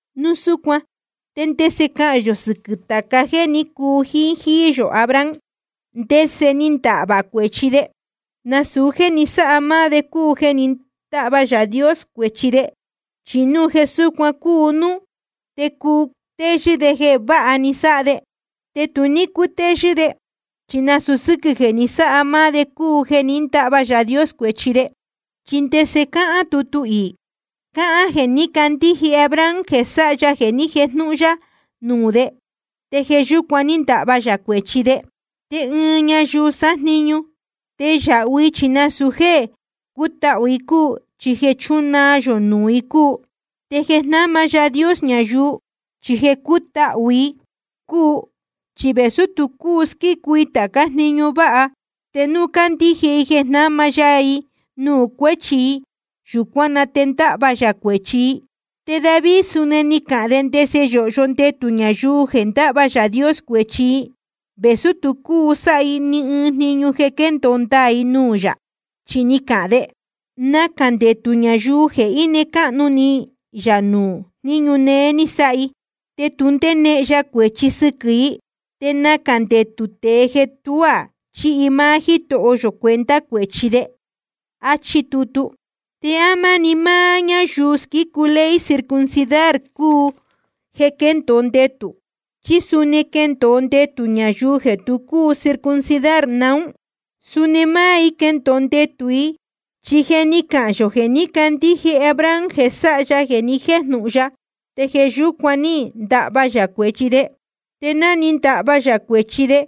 Núu súcuan ¿te ndese cahān yō sɨquɨ̄ tāca jéē ní cuu jíín jíí yō Abraham? ¿Ndese ni ndahvā cuēchi de? Nasūu jéē ni sáha máá de cúu jeē ní ndahva Yaā Dios cuēchi de. Chi núu jeē súcuan cúu núú, te cuu cutéyɨ́ de jeē váha ni sáha de. Te tu ní cútéyɨ́ de, chi nasūu sɨ́quɨ̄ jeē ni sáha máá de cúu jeē ní ndahva Yaā Dios cuēchi de. ¿Chi ndese cáhán tutu iī? Cáhán jeē ní candíje Abraham jeē sáha ya jeē ni jéjnūhun ya nuū de, te jeē yúcuan ní ndahva yā cuēchi de. Te ɨɨn ñayuu sájniñu, te yāhu i chi nasūu jéē cútahū i cúu, chi jeē chúnaa yō nuū i cúu. Te jeē jnáma Yaā Dios ñayuu, chi jeē cútahū i cúu. Chi vēsú tu cúu squícu i tācá jniñu váha, te núu candíje i jeē jnáma ya i nuū cuéchi i, yūcuán na te ndahva yā cuēchi i. Te David suni ni cahān de ndese yōhyo ndetū ñayuu jeē ndáhva Yaā Dios cuēchi i, vēsú tu cúu sáha i ni ɨɨn jniñu jeē quéndōo ndaā i nuū yā. Chi ni cahān de: Nacā ndetū ñayuu jeē íne cáhnu ni yā nuū jníñu néé ni sáha i, te tu ndénehen ya cuēchi sɨquɨ̄ i. Te nacā ndetū tēe jeē tuá chíhi máá Jítoho yō cuenta cuēchi de. Achí tutu. ¿Te á máni máá ñáyuu squícu ley circuncidar cúu jeē quéndōo ndetū? ¿Chí suni quéndōo ndetū ñayuu jeē tu cúu circuncidar naún? Suni máá i quéndōo ndetū i. Chi je ni cahān yō jeē ní candíje Abraham jeē sáha ya jeē ni jéjnūhun ya, te jeē yúcuan ní ndahva yā cuēchi de. Te ná ni ndahva yā cuēchi de,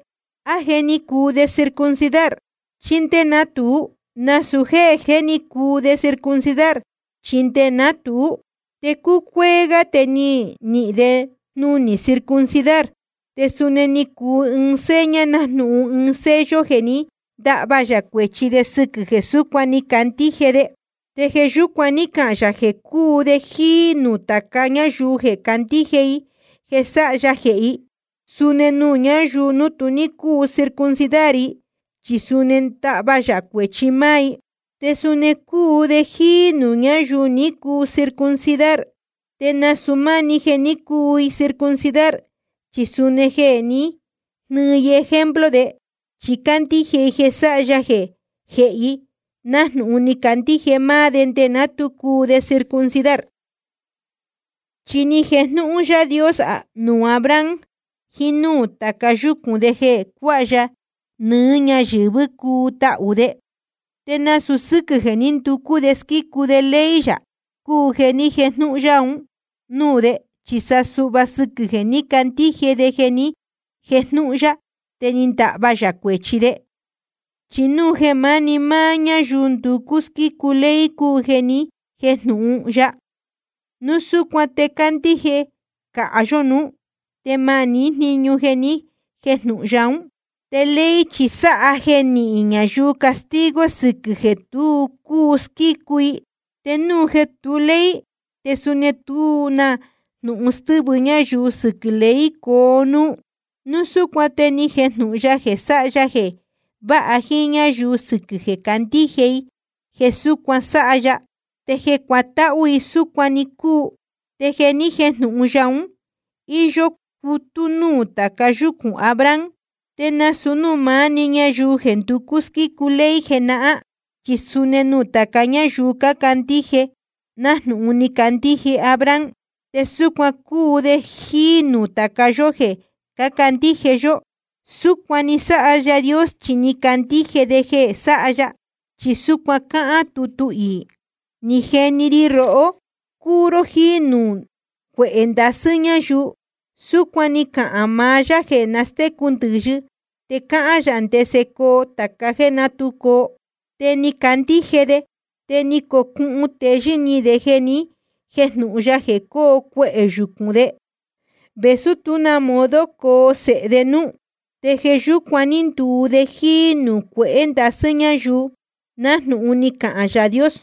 ¿á je ni cuu de circuncidar, chí ndé ná tuú? Nasūu jéē jé ni cuu de circuncidar, chi nde ná tuú. Te cuéé gá te ni nihīn de jnunī circuncidar. Te suu ni cuu ɨɨn seña, nájnūhun ɨɨn sello jeē ní ndahva yā cuēchi de sɨquɨ̄ jeē súcuan ni candíje de. Te jeē yúcuan ní cahān yā jeē cuu de jíí nuū tāca ñáyuu jeē candíje i jeē sáha ya jehē i, suni nuū ñáyuu tu ní cúu circuncidar, chi suni ndahva yā cuēchi máá i. Te suni cúu de jíí nuū ñáyuu ní cuu circuncidar, te nasūu máni jeē ní cuu i circuncidar, chi suni jeē ní jnɨɨ i ejemplo de. Chi cácandíje i jeē sáha ya jehē i, nájnūhun ni candíje máá de nde ná tu cuu de circuncidar. Chi ni jejnūhun Yaā Dios nuū Abraham jiín núū tāca yúcūn de jeē cuāha ya nɨɨ́ ñáyɨ̄vɨ́ cuu tahū de. Te nasūu sɨ́quɨ̄ jeē ní nducú de squícu de ley yā cúu jeē ní jejnūhun ya un núū de, chi sa suhva sɨquɨ̄ jeē ní candíje de jeē ni jéjnūhun ya, te ni ndahva yā cuēchi de. Chi núu jeē máni máá ñáyuu nducú squícu ley cúu jeē nihín jeē ni jéjnūhun ya, núu súcuan te cándíje cāha yó nuú, te ma nihín jníñu jeē ni jéjnūhun ya ún. Te ley chi sáha jeē nihín ñayuu castigo sɨquɨ̄ jeē tu cúu squícu i. Te núu jeē tu ley, te suni tú na jnūhun stɨ́vɨ ñayuu sɨquɨ̄ ley coo núú. Núu súcuan te ni jejnūhun ya jeē sáha ya jeē váha jíín ñáyuu sɨquɨ̄ jeē candíje i jeē súcuan sáha ya, te jeē cútahū i súcuan‑ni cúu. Te jeē ni jéjnūhun ya ún, íyó cutú nuū tāca yúcūn Abraham, te nasūu núū maá‑ni ñayuu jeē nducú squícu ley jenahán, chi suni nuū tāca ñáyuu cácandíje nájnūhun ni candíje Abraham. Te súcuan cúu de jíí nuū tāca yó jeē cácandíje yó. Súcuan ni sáha Yaā Dios chi ni candíje de jeē sáha ya. Chi súcuan cáhán tutu iī: Ni jeni ri rohó cuu ró jíí nuū cuehē ndasɨ́ ñáyuu. Súcuan ni cahān maá Yaā jeē nastécu ndɨ̄yɨ te cáhán yā ndese coo tāca jéē ná tu coo. Te ni candíje de, te ni cocuhun teyɨ́ ni de jeē ni jéjnūhun ya jeē coo cuehē yucūn de, vēsú tuá na modo coo sēhe de núú. Te jeē yúcuan ní nduu de jíí nuū cuehē ndasɨ́ ñáyuu, nájnūhun ni cahān Yaā Dios: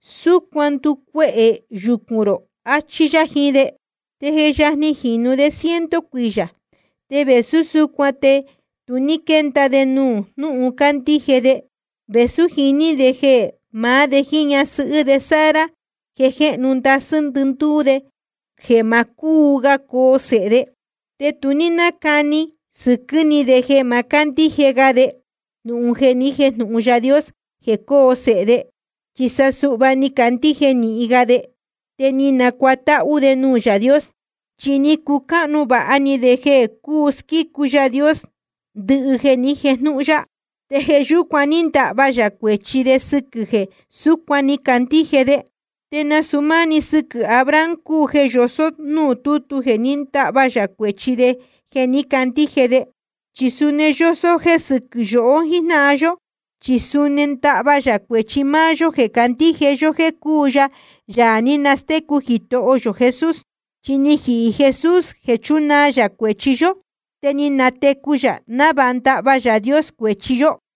Súcuan nducuehē yucūn rō, achí yá jiín de. Te je yajni jinū de ciento cuiyā, te vēsú súcuan te tu ní quénda de nuū jnúhun cándíje de, vēsú jiní de jeē maá de jíín ñasɨhɨ́ de Sara je jéhnu ndasɨ́ ndɨndúú de jeē ma cúu ga coo sēhe de. Te tu ní nácani sɨquɨ́ ni de jeē ma cándíje ga de jnūhun ní jejnūhun Yaā Dios jeē coo sēhe de. Chi sa suhva ni candíje nīhin ga de, te ni nacuatáhú de nuū Yaā Dios. Chi ni cucáhnu vāha ni de jeē cúu squícu Yaā Dios ndɨhɨ jeē ni jéjnūhun ya. Te jeē yúcuan ní ndahva yā cuēchi de sɨquɨ̄ jeē súcuan ni candíje de. Te nasūu máá‑ni sɨquɨ̄ Abraham cúu jeē yosó núū tútu jeē ní ndahva yā cuēchi de jeē ní candíje de. Chi suni yósó jéē sɨquɨ́ yohó jíjnáhan yó. Chi suni ndáhva yā cuēchi máá yó jéē candíje yó jéē cúu ya Yaā ní nastécu Jitoho yō Jesús. Chi ni jihī Jesús jeē chúnaa yā cuēchi yó, te ni natecu yā návāha ndahva Yaā Dios cuēchi yó.